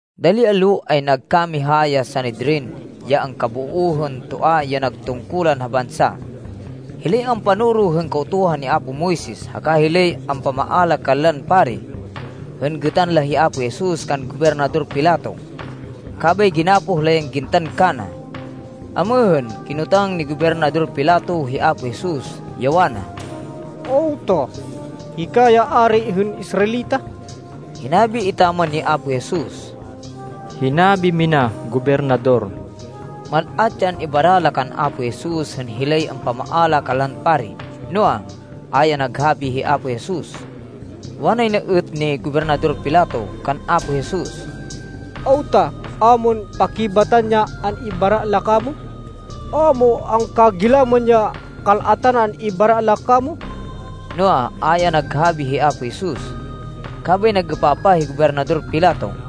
Dali allo, ay nagkamiha ya Sanedrin, ya angkaboo hên toa ya nag tungkulan ha bansa, hilay ampanoro hên Kautuhan ni apo Moises, haka hilay ampamaala kanlan pari, hên gêtan la hi Apo Jesus kan Gobernador Pilato. Kabay ginapoh la yan gintan kana. Amêhên, kinotang ni Gobernador Pilato hi Apo Jesus, ya wana, “Awta? Hika ya ari hên Israelita?” Hinabi etaman ni Apo Jesus, “Hinabi mina, Gobernador.” Mal-at ya an-ibara la kan Apo Jesus hên hilay ampamaala kanlan pari. Noa, a ya naghabi hi Apo Jesus. Wanay na êt ni Gobernador Pilato kan Apo Jesus, “Awta a mon pakibatan ya an-ibara la kamo? A mo angkagilaman ya kal-atan an-ibara la kamo?” Noa, a ya naghabi hi Apo Jesus. Kabay nag-êpapah hi Gobernador Pilato.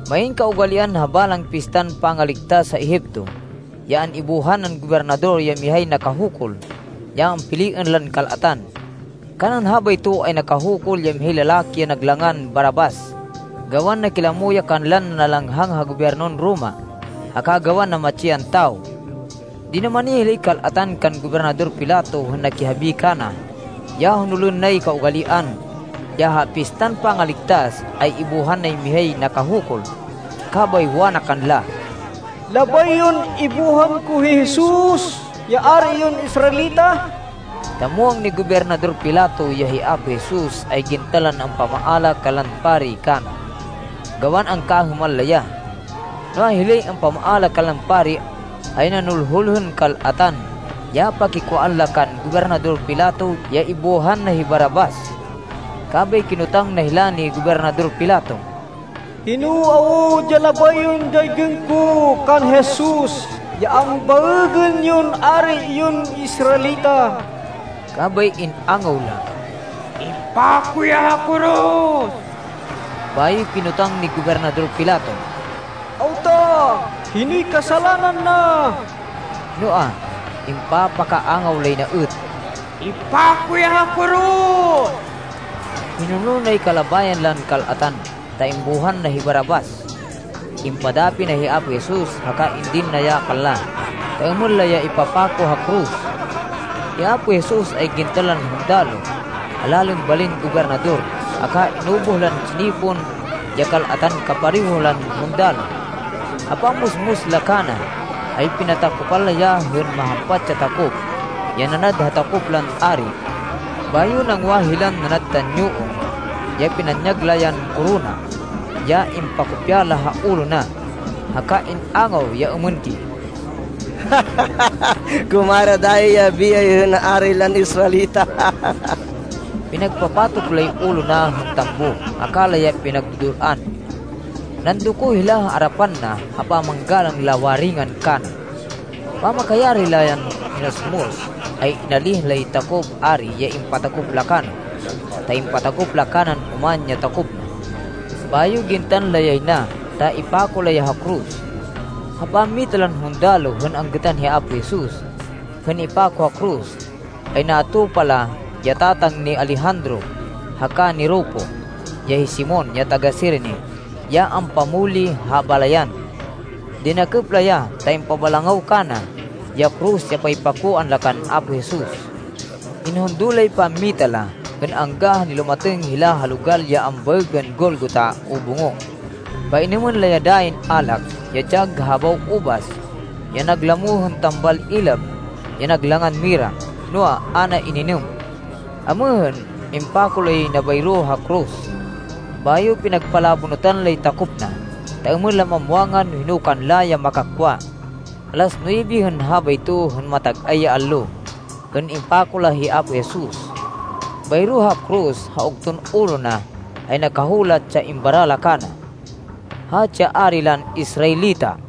Main kaugalian, ha balang Pistan Pangaligtas ha Egipto, ya an-ibuhan nan gobernador ya mihay nakahukul ya ampiliên lan kal-atan. Kanan habayto, ay nakahukul ya mihay lalaki ya nag langan Barrabas, gawan nakilamo ya kanlan nanalanghang ha gobyernon Roma, haka gawan namatsi yan tawo. Dinumani hilay kal-atan kan Gobernador Pilato hên nakihabi kana ya honolên nay kaugalian, ya ha Pistan Pangaligtas, ay ibuhan nay mihay nakahukul. Kabay wana kanla, “Labay yon ibuhan ko hi Jesus, ya Ari yon Israelita?” Ta muwang ni Gobernador Pilato ya hi Apo Jesus, ay gintan lan ampamaala kanlan pari kana, gawan angkahêman la ya. Noa, hilay ampamaala kanlan pari, ay nanulhul hên kal-atan ya pakikwaan la kan Gobernador Pilato ya ibuhan na hi Barrabas. Kabay kinotang na hila ni Gobernador Pilato, “Hino awud ya labay yon daygên ko kan Jesus ya ambaêgên yon Ari yon Israelita?” Kabay in-angaw la, “Ipako ya ha koros!” Bayo kinotang ni Gobernador Pilato, “Awta? Hinoy kasalanan na?” Noa, impapakaangaw lay na êt, “Ipako ya ha koros!” Hinonol nay kalabayan lan kal-atan, ta imbuhan na hi Barrabas. Impadapi na hi Apo Jesus, haka indin na ya kanla, ta êmên la ya ipapako ha koros. Hi Apo Jesus ay gintan lan hundaloh ha lalên balin gobernador, haka inubuh lan tsinipon ya kal-atan kapareho lan hundaloh. Ha pammusmus la kana, ay pinatakopan la ya hên mahampat ya takop, ya nanad ha takop lan ari. Bayo nangwa hilan nanad tanyuong, ya pinanyag la yan korona, ya impakopya la ha ulo na. Haka in-angaw ya êmên di, “Kumara dayi ya biyay hên Ari lan Israelita!” Pinagpapatok lay ulo na hên tambo, haka la ya pinagdu-dul-an. Nandoko hila ha arapan na ha pamanggalang la waringan kana. Pamakayari la yan minusmus, ay inalíh lay takop ari ya impatakop la kana, ta impatakop la kanan oman ya takop na. Bayo gintan la yay na, ta ipako la ya ha koros. Ha pammita lan hundaloh hên anggêtan hi Apo Jesus, hên ipako ha koros, ay natupa la ya tatang ni Alejandro haka ni Rufo, ya hi Simon ya taga-Cirene, ya ampamuli ha balayan. Dinakêp la ya ta impabalangaw kana ya koros ya paypakoan la kan Apo Jesus. Inhundo lay pammita la, hên angga ha nilumatêng hila ha logal ya ambaêgên Golgota o Bungo. Painêmên la ya dayin alak, ya dyag ha habaw ubas, ya naglamo hên tambal ilab ya nag langan mira, noa, a na ininêm. Amêhên, impako la yay na bayro ha koros. Bayo pinagpalabonutan lay takop na, ta êmên la mamwangan no hino kanla ya makakwa. Alas nuwebe hên habayto, hên matag-ay ya allo, hên impako la hi Apo Jesus. Bayro ha koros, ha ugton ulo na, ay nakahulat ya imbara la kana, “Hatsi ya Ari lan Israelita.”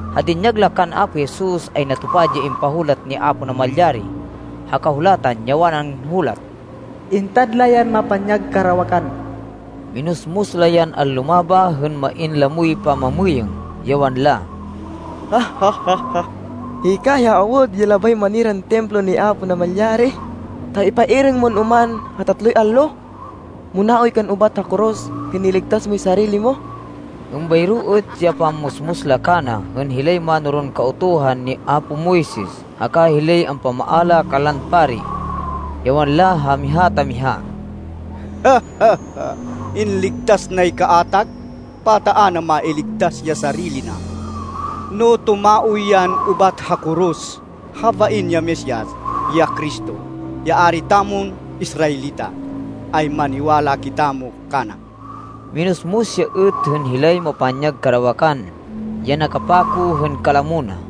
Ha dinyag la kan Apo Jesus, ay natupad ya impahulat ni Apo Namalyari ha Kahulatan ya wanan hulat, “Intad la yan mapanyag karawakan.” Minusmus la yan anlumabah hên main lamoy pamamêyêng, ya wanla, “Hika awud ya labay maniran Templo ni Apo Namalyari, ta ipairêng mon oman ha tatloy allo! Munaoy kan ubat ha koros hên iligtas moy sarili mo!” Êmbayro êt ya pammusmus la kana hên hilay mánoron Kautuhan ni apo Moises haka hilay ampamaala kanlan pari, ya wanla ha miha ta miha, “Inligtas nay kaatag, pata a na mailigtas ya sarili na! No tumaoy yan ubat ha koros, habain ya Mesias, ya Cristo, ya Ari tamon Israelita, ay maniwala kitamo kana!” Minusmus ya êt, hên hilay mapanyag karawakan ya nakapako hên kalamo na.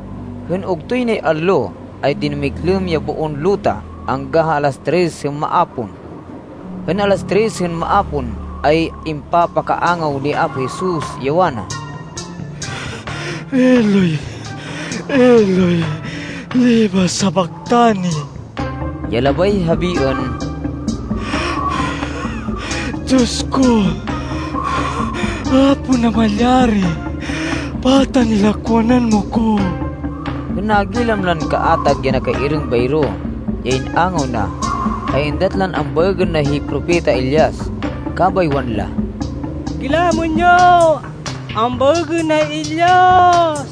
Hên ugtoy nay allo, ay dinumiglêm ya boon luta angga ha alas tres hên maapon. Hên alas tres hên maapon, ay impakaangaw ni Apo Jesus, ya wana, “Eloi, Eloi, lema sabachthani?” ya labay habiên, “Diyos ko, Apo Namalyari, pata nilakwanan mo ko?” Hên nagilam lan kaatag ya nakairêng bayro ya in-angaw na, ay êndat lan ambaêgên na hi Propeta Elias, kabay wanla, “Gilamên yo! Ambaêgên na hi Elias!”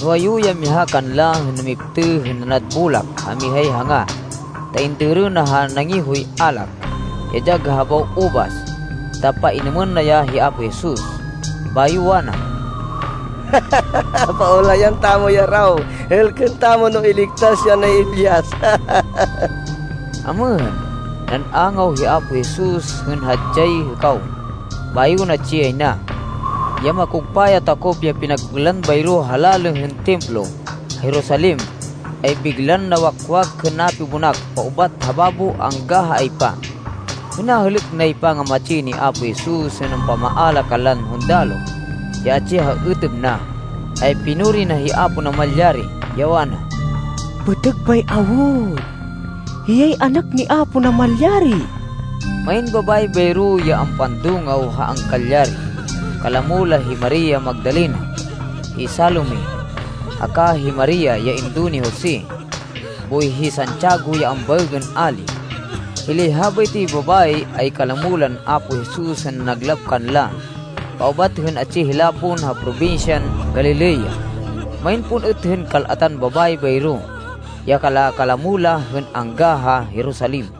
Nuwayu ya miha kanla hên namiptêh hên nanad bolak ha mihay hanga, ta indêrê na ha nangihoy alak, ya dyag ha habaw ubas, ta painêmên na ya hi Apo Jesus. Bayo wana, “Paulayan tamo ya raw. Hêlkên tamo no iligtas ya ni Elias!” Amêhên, nan-angaw hi Apo Jesus hên hadyay hêkaw, bayo natsi yay na. Ya makugpa ya takop ya pinagpênlan bayro ha lalê hên Templo ha Jerusalem, ay biglan nawakwak hên napibonak paubat ha babo angga ha aypa. Hên nahêlêk nay pangamatsi ni Apo Jesus hên ampamaala kanlan hundaloh, ya atsi ha êtêb na, ay pinuri na hi Apo Namalyari, ya wana, “Pêtêg bay awud! Hiyay Anak ni Apo Namalyari!” Main babayi bayro ya ampandungaw ha angkalyari. Kalamo la hi Maria Magdalena, hi Salome haka, hi Maria ya indo ni Jose boy hi Santiago ya ambaêgên Ali. Hilay habaytoy babayi ay kalamo lan Apo Jesus hên nanaglap kanla paubat hên atsi hila pon ha probinsyan Galilea. Main pon êt hên kal-atan babayi bayro, ya kala-kalamo la hên angga ha Jerusalem.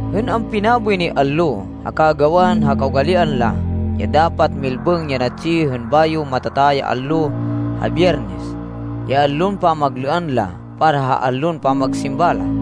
Hên ampinaboy nay allo, haka gawan ha kaugalian la, ya dapat milbêng ya natsi, hên bayo matata ya allo ha Biyernes, ya allon pamaglêan la para ha allon pamagsimba la,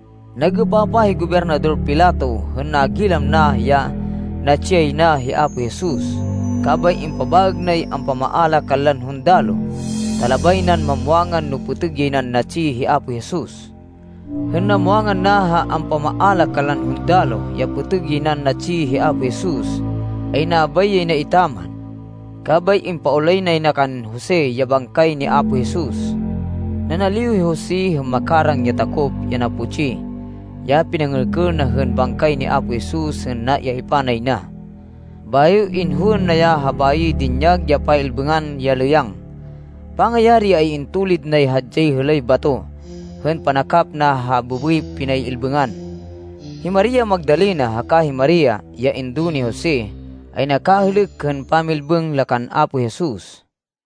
Nag-êpapah hi Gobernador Pilato hên nagilam na ya natsi yay na hi Apo Jesus. Kabay impabaêg nay ampamaala kanlan hundaloh, ta labay nan mamwangan no pêtêg yay nan natsi hi Apo Jesus. Hên namwangan na ha ampamaala kanlan hundaloh ya pêtêg yay nan natsi hi Apo Jesus, ay nabay yay na etaman. Kabay impaulay nay na kan Jose ya bangkay ni Apo Jesus. Nanaliw hi Jose hên makarang ya takop ya naputsi ya pinangêlkêl na hên bangkay ni Apo Jesus hên naiaypa nay na. Bayo inhowên na ya ha bayoy dinyag ya pay-ilbêngan ya lêyang. Pangayari, ay intulid nay hadyay hêlay bato hên panakap na ha bêbêy pinay-ilbêngan. Hi Maria Magdalena haka hi Maria, ya indo ni Jose ay nakahêlêk hên pamilbêng la kan Apo Jesus.